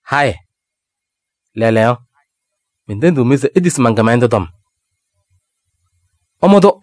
Hayɩ! Lɛɛlɛɛyɔ, mentendiɣ-mɩ se itisi man-kɩmɛlɛndʋ tɔm. Ɩmʋ-tʋ.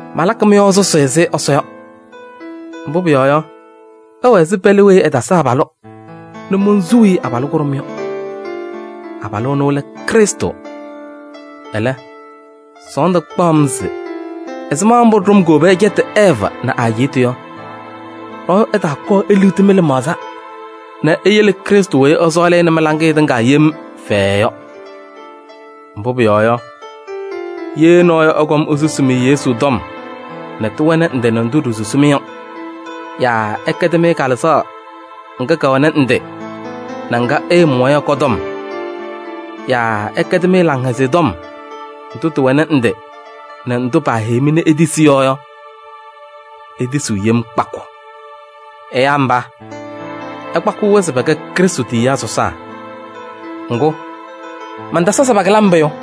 Malakɩ mɩ-yɔɔ sʋsɩ ɛzɩ Ɛsɔ yɔ. Mbʋ pʋyɔɔ yɔ, ɩwɛ ɛzɩ pɛlɛ weyi ɛtasɩ abalʋ nɛ monsuu-i abalʋ kʋɖʋm yɔ. Abalʋ ɛnʋ lɛ Krɩstʋ. Ɛlɛ, sɔɔndʋ kpaɣ-m se ɛzɩma mbʋ ɖʋm kowobi ɛcɛtɩ Ɛɛvɩ nɛ ɛ-ajiitu yɔ, nɔɔyʋ ɛɛtaakɔɔ eliɣti mɩ-lɩmaɣza nɛ iyele Krɩstʋ weyi ɩsɔɔlɩ-ɩ nɛ mɩ-laŋɩyɛ tɩŋa yem fɛɛɛ yɔ. Mbʋ pʋyɔɔ yɔ, ye nɔɔyʋ ɛkɔm esusi-mɩ Yesu tɔm nɛ tɩwɛnɩ ndɩ nɛ ndʋ ɖiisusi-mɩ yɔ yaa ɛkɛdɩ-mɩ kalɩzaɣ ŋga kɛwɛnɩ ndɩ nɛ ŋga ɩɩmʋwa yɔ kɔ-tɔm yaa ɛkɛdɩ-mɩ Laŋhɛzɩyɛ Tɔm ndʋ tɩwɛnɩ ndɩ nɛ ndʋ paaheyi-mɩ nɛ itisi yɔ yɔ, itisiɣ yem kpakʋ. Ɛyaa mba, ɩkpakɩɣ-wɛ se pɛkɛ Krɩstʋ tiyiyaa sɔsaa. Ŋgʋ, mantasa se pakɩlɩ-m pʋyʋ!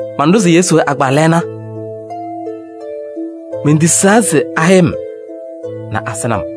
Manɖʋzɩ Yesu agbaa lɛɛna. Mentisaa se ahɛyɩ-m nɛ mansɩnɩ-mɩ.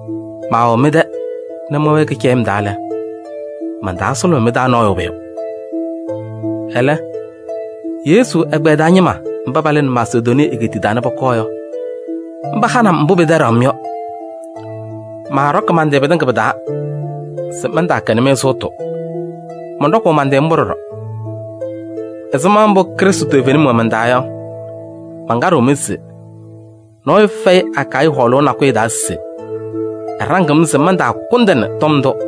Maawɛ mɩ-tɛ nɛ mɛwɛɛ kɩcɛyɩm taa lɛ, mantasʋlʋmɩ mɩ-taa nɔɔyʋ pʋyʋ. Ɛlɛ, Yesu ɛgbɛyɛ taa ñɩma mba palɩnɩ Masedonii egeetiye nɛ pɔkɔɔ yɔ, mba hanɩ-m mbʋ pɩtɛɖaɣ-m yɔ. Maaɖɔkɩ man-tɩ pɩtɩŋa pɩ-taa se mantaakɛnɩ-mɩ sʋʋtʋ, mɔnɖɔkʋʋ man-tɩ mbʋ ɖɔɖɔ. Ɛzɩma mbʋ Krɩstʋ toovenim wɛ man-taa yɔ, mankaɖɩɣ-mɩ se: nɔɔyʋ fɛyɩ Akayɩ hɔɔlʋʋ nakʋyʋ taa se ɛɖaŋɩɣ-m se mantaakʋndɩnɩ tɔm ndʋ.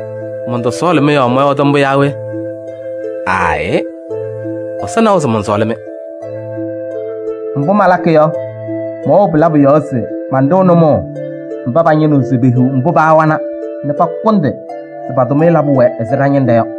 Mɔntɔsɔɔlɩ-mɩ yɔɔ mɔyɔɔdɩ mbʋ yaa we? Aayɩ! Ɛsɔ nawa se mɔnsɔɔlɩ-mɩ. Mbʋ malakɩ yɔ, mɛwɛɣ pɩ-labʋ yɔɔ se manɖɩɣ nʋmɔʋ mba pañɩnɩɣ se pehiɣ mbʋ paawana nɛ pakʋndɩ se pa-tʋmɩyɛ labʋ wɛ ɛzɩ ɖa-ñɩnɖɛ yɔ.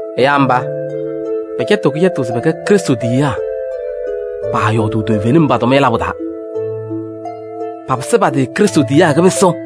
Ɛyaa mba, pɛcɛtɩɣ kɩcɛtʋ se pɛkɛ Krɩstʋ tiyiyaa. Paayɔɔdʋʋ toovenim pa-tʋmɩyɛ labʋ taa. Papɩsɩ pa-tɩ Krɩstʋ tiyiyaa kɩpɩsʋ.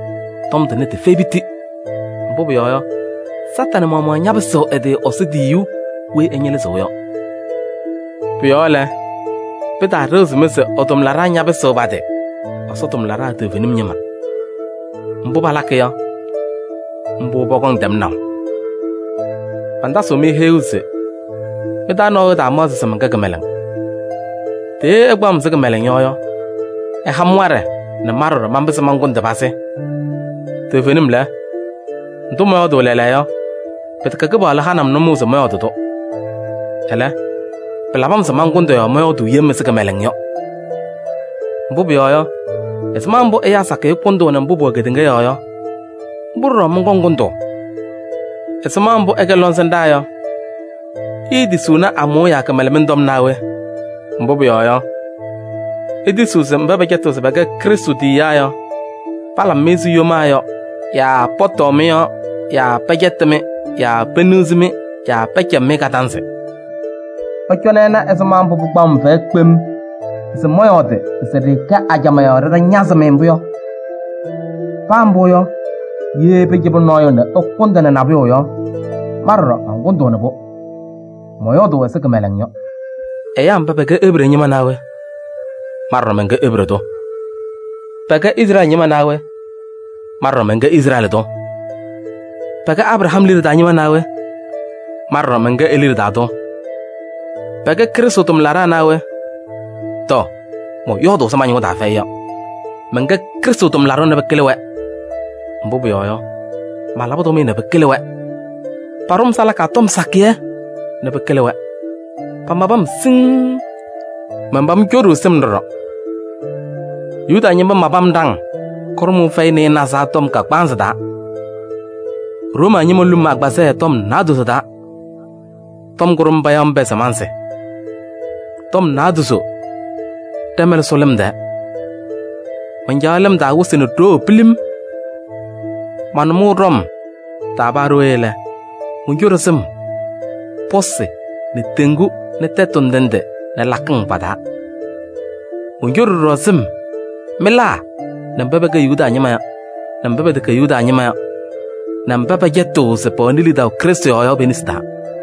Tɔm tʋnɛ tɩfɛyɩ piti. Mbʋ pʋyɔɔ yɔ, Satanɩ maɣmaɣ ñapɩsɩɣ ɛ-tɩ Ɛsɔ tiyiyu weyi ɛñɩlɩzɩɣ yɔ. Pʋ-yɔɔ lɛ, pɩtaaɖɩɣzɩ-mɩ se ɛ-tʋmlaɖaa ñapɩsɩɣ pa-tɩ Ɛsɔ tʋmlaɖaa toovenim ñɩma. Mbʋ palakɩ yɔ, mbʋ pɔkɔŋ tɛmnaʋ. Mantasɩɣ-mɩ heyuu se mɩ-taa nɔɔyʋ ɛtaamaɣzɩ se mɛnkɛ kɩmɛlɛŋ. Tɛ ye ɩkpaɣ-m ɛzɩ kɩmɛlɛŋ yɔ yɔ, ɩha-m waɖɛ nɛ ma ɖɔɖɔ manpɩzɩ mankʋndɩ pazɩ. Toovenim lɛ, ndʋ mɔyɔɔdʋʋ lɛɛlɛɛyɔ, pɩtɛkɛ Kɩpaɣlʋ hanɩ-m nʋmɔʋ se mɔyɔɔdɩ-tʋ. Ɛlɛ, pɩlabɩ-m se mankʋndɩ yɔɔ mɔyɔɔdʋʋ yem ɛzɩ kɩmɛlɛŋ yɔ. Mbʋ pʋyɔɔ yɔ, ɛzɩma mbʋ ɛyaa sakɩyɛ kʋndʋʋnɩ mbʋ pʋwɛ kedeŋa yɔɔ yɔ, mbʋ ɖɔɖɔ mɔnkɔŋ kʋndʋʋ. Ɛzɩma mbʋ ɩkɛ lɔŋsɩnɖaa yɔ, iitisiɣni amʋʋya kɩmɛlɛmɩŋ tɔm naa we? Mbʋ pʋyɔɔ yɔ, itisiɣ se mba pɛcɛtɩɣ se pɛkɛ Krɩstʋ tiyiyaa yɔ, palabɩ-mɩ ɛzɩ yomaa yɔ yaa pɔtɔɔ mɩ-yɔɔ yaa pɛcɛtɩ-mɩ yaa peniɣzi-mɩ yaa pɛcɛbɩ-mɩ kadanzɩ. Ɩcɔnɩ ɩna ɛzɩma mbʋ pɩkpaɣ-m fɛyɛ kpem se mɔyɔɔdɩ se ɖɩɩkɛ ajamaa yɔɔ ɖɩtanazɩ-mɩ mbʋ yɔ! Paa mbʋ yɔ, ye pɩcɩbɩ nɔɔyʋ nɛ ɛkʋndɩnɩ nabʋyʋ yɔ, ma ɖɔɖɔ mankʋndʋʋnɩ-pʋ. Mɔyɔɔdʋʋ ɛzɩ kɩmɛlɛŋ yɔ. Ɛyaa mba pɛkɛ Ebree ñɩma naa we? Ma ɖɔɖɔ mɛnkɛ Ebree tʋ. Pɛkɛ Izrɛɛlɩ ñɩma naa we? Ma ɖɔɖɔ mɛnkɛ Izrɛɛlɩ tʋ. Pɛkɛ Abraham liɖe taa ñɩma naa we? Ma ɖɔɖɔ mɛnkɛ e-liɖe taa tʋ. Pɛkɛ Krɩstʋ tʋmlaɖaa naa we? Tɔɔ! Mɔyɔɔdʋʋ ɛzɩ ma-ñʋʋ taa fɛyɩ yɔ. Mɛnkɛ Krɩstʋ tʋmlaɖʋ nɛ pɩkɩlɩ-wɛ. Mbʋ pʋyɔɔ yɔ, malabɩ tʋmɩyɛ nɛ pɩkɩlɩ-wɛ. Paɖʋ-m salaka tɔm sakɩyɛ nɛ pɩkɩlɩ-wɛ. Pamabɩ-m siŋŋ. Manpam coɖuu sɩm ɖɔɖɔ. Yuda ñɩma mabɩ-m ɖaŋ kʋɖʋmʋʋ fɛyɩ nɩɩnaza tɔm kagbaanzɩ taa. Room ñɩma ñolu-m agbazɛɛ tɔm naadozo taa. Tɔm kʋɖʋm payaɣ-m pɛɛ se mansɩ. Tɔm naadozo ɖɛ-mɛlɛ sʋ lɩm. Mancaɣ lɩm taa wɩsɩ nɛ ɖoo pilim. Ma-nʋmɔŋ ɖɔm taa paa ɖooye lɛ, moncoɖi sɩm pɔsɩ nɛ teŋgu nɛ tɛtʋ ndɩ ndɩ nɛ lakɩŋ pa-taa. Moncoɖi ɖɔɖɔ sɩm mɩlaa nɛ mba pɛkɛ Yuda ñɩma nɛ mba pɛtɛkɛ Yuda ñɩma yɔ nɛ mba pɛcɛtɩɣ se pɛwɛnɩ lidaʋ Krɩstʋ yɔɔ yɔ pe-nesi taa.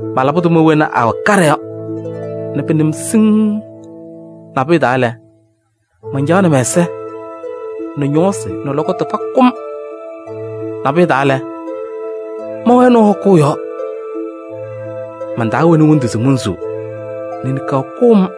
Malabɩ tʋma wena awɛ kaɖɛ yɔ nɛ pɩnɩ-m siŋŋ. Nabʋyʋ taa lɛ, mancaɣnɩ mɛ-ɛza nɛ ñɔɔsɩ nɛ lɔkɔtʋ pakʋ-m. Nabʋyʋ taa lɛ, mɛwɛɛ nɔɔ hɔkʋʋ yɔɔ. Mantaawɛnɩ wondu se monsuu nɛ niŋkaɣ kʋ-m.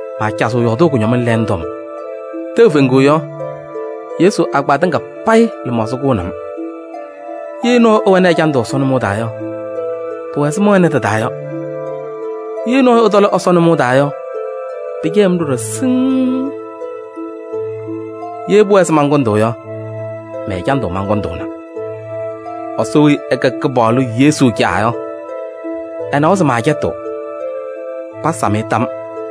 Maacazɩɣ yɔɔdʋʋ kʋñɔmɩŋ lɛɛŋ tɔm. Tɛʋ feŋuu yɔ, Yesu agbaa tɩŋa payɩ lɩmaɣza kʋʋnɩ-m. Ye nɔɔyʋ ɛwɛnɩ ɛjandʋ Ɛsɔ nʋmɔʋ taa yɔ, pʋwɛ ɛzɩ mɛwɛnɩ tɩ-taa yɔ. Ye nɔɔyʋ ɛtɔlɩ Ɛsɔ nʋmɔʋ taa yɔ, pɩcɛyɩɣ-m ɖɔɖɔ siŋŋ. Ye pʋwɛɛ se mankʋndɩ yɔ, mɛ-ɛjandʋ mankʋndʋʋna. Ɛsɔ weyi ɛkɛ Kɩpaɣlʋ Yesu Caa yɔ, ɛnawa se maacɛtɩɣ! Pasam-ɩ tam!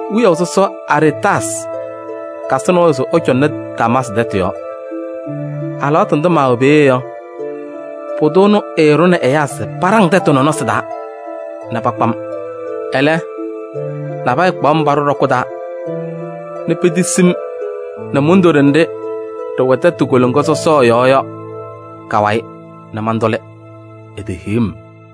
Wiyaʋ sɔsɔ Aretaasɩ kasɩ nɔɔyʋ se ɛcɔŋnɩ Damaasɩ tɛtʋ yɔɔ. Alɩwaatʋ ndʋ maawɛ peeye yɔ, pʋdʋ ɛnʋ ɛɛɖʋnɩ ɛyaa se paɖaŋ tɛtʋ nɔnɔsɩ taa nɛ pakpa-m. Ɛlɛ, nabɛyɛ kpaɣ-m paɖʋ ɖɔkʋ taa nɛ petisi-m nɛ mundoɖe nɖɩ ɖɩwɛ tɛtʋ koloŋa sɔsɔ yɔɔ yɔ ka-wayɩ nɛ mantʋlɩ, etehiɣ-m.